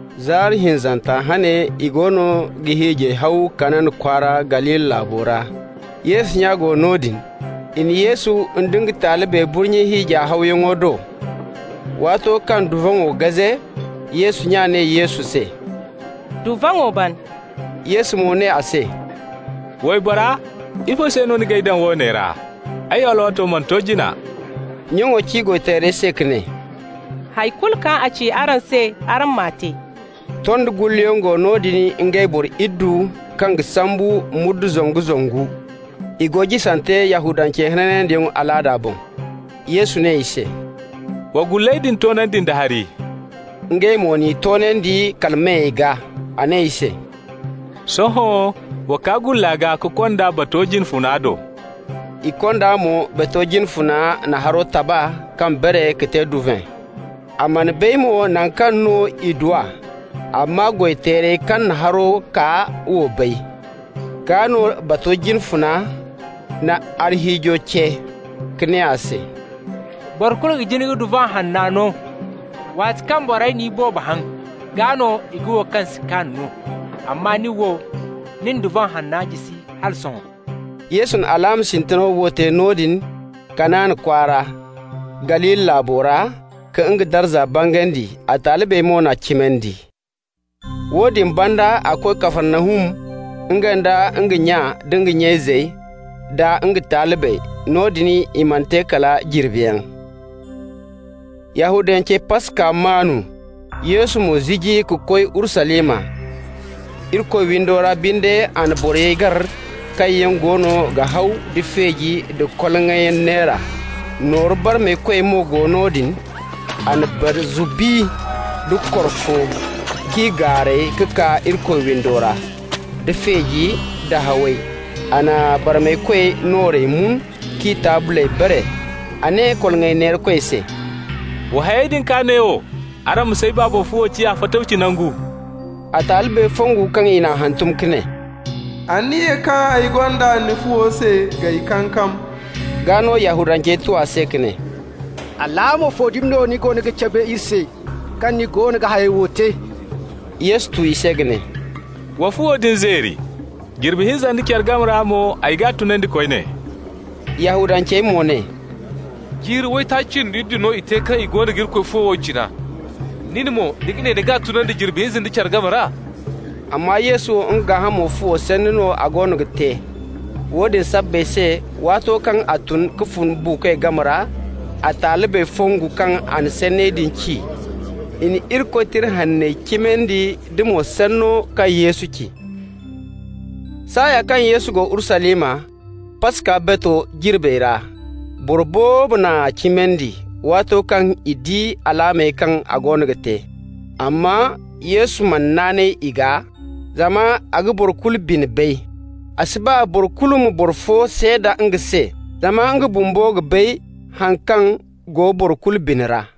Zaari hinzanta hane i goono ga hiijay haw Kana kwaara Galili laabo ra. Yesu nya go noodin. I na Yesu nda nga talibey burnye hiija hawyaŋo do. Waato kaŋ duvaŋo gaze, Yesu nya ne Yesu se: «Duvaŋo ban.» Yesu mo ne a se: «Waybora, ifo se no ni g'ay daŋ woone ra? Ay alwaato mana to jina.» Nyaŋo ci goy-teerey se ka ne: «Hay kulu kaŋ a ci araŋ se, araŋ m'a te.» Tondi gullayaŋ go noodin, ngey boro iddu, kaŋ ga sambu muudu zangu-zangu. I go jisante Yahudancey hananyaŋ alaada boŋ. Yesu ne i se: «Wa gulley din toonandi nda hari.» Ngey mo n'i toonandi kala meyey gaa. A ne i se: «Sohõ, wa kaa gulla gaa ka konda bato jine funa do.» I konda mo. Bato jine funa na haro taba kaŋ bare ka te duvan. A mana bay mo naŋ kaŋ no i du a (amma goy-teerey kaŋ na haro kaa wo bay). Gaa no bato jine funa na arhiijo ce ka ne a se: «Boro kulu ga jin ka duvan hanna no, waati kaŋ borey na iboobo haŋ, gaa no i ga wo kaŋ si kaan no. Amma nin wo, ni na duvan hanna jisi hala sohõ.» Yesu na alaama sintina wo te noodin Kana kwaara Galili laabo ra ka nga darza bangandi. A talibey mo n'a cimandi. Woodin banda a koy Kafarnahum, nga nda nga nya nda nga nya izey, da nga talibey. Noodin i mana te kala jirbiyaŋ. Yahudancey Paska maanu, Yesu mo ziji ka koy Urusalima. Irikoy windo ra binde a na borey gar kaŋ yaŋ goono ga haw da feeji da koloŋay neera. Nooru barmaykoy mo go ga goro noodin. A na barzu bi nda korfo k'i gaaray ka kaa Irikoy windo ra, da feejey da hawey. A na barmaykoy noorey mun k'i taabley bare. A ne koloŋay neerakoy se: «Wa hayey din kaa neewo! Araŋ ma s'ay Baaba fuwo ciya fatawci nangu.» A talibey fongu kaŋ i n'a hantum ka ne: «Anniya kaŋ ay gonda ni fuwo se g'ay kankam.» Gaa no, Yahudancey tu a se ka ne: «Alaama fo dumi no ni ga cabe iri se, kaŋ ni goono ga hayey wo te?» Yesu tu i se ka ne: «Wa fuwo din zeeri, jirbi hinza nda care game ra mo ay g'a tunandi koyne.» Yahudancey mo ne: «Jiiri waytaaci cindi iddu no i te kaŋ i goono ga Irikoy fuwo wo cina. Nin mo, ni ga ne ni g'a tunandi jirbi hinza nda care game ra?» Amma Yesu wo, nga gaahamo fuwo sanni no a goono ga te. Woodin sabbay se, waato kaŋ a tun ka fun buukoy game ra, a talibey fongu kaŋ a na sanney din ci. I na Irikoy Tira Hanney cimandi da mo sanno kaŋ Yesu ci. Saaya kaŋ Yesu go Urusalima Paska bato jirbey ra, boro boobo n'a cimandi, waato kaŋ i di alaamey kaŋ a goono ga te. Amma Yesu mana naanay i gaa, zama a ga boro kulu bine bay. A si ba boro kulu ma boro fo seeda nga se, zama nga bumbo ga bay haŋ kaŋ go boro kulu bine ra.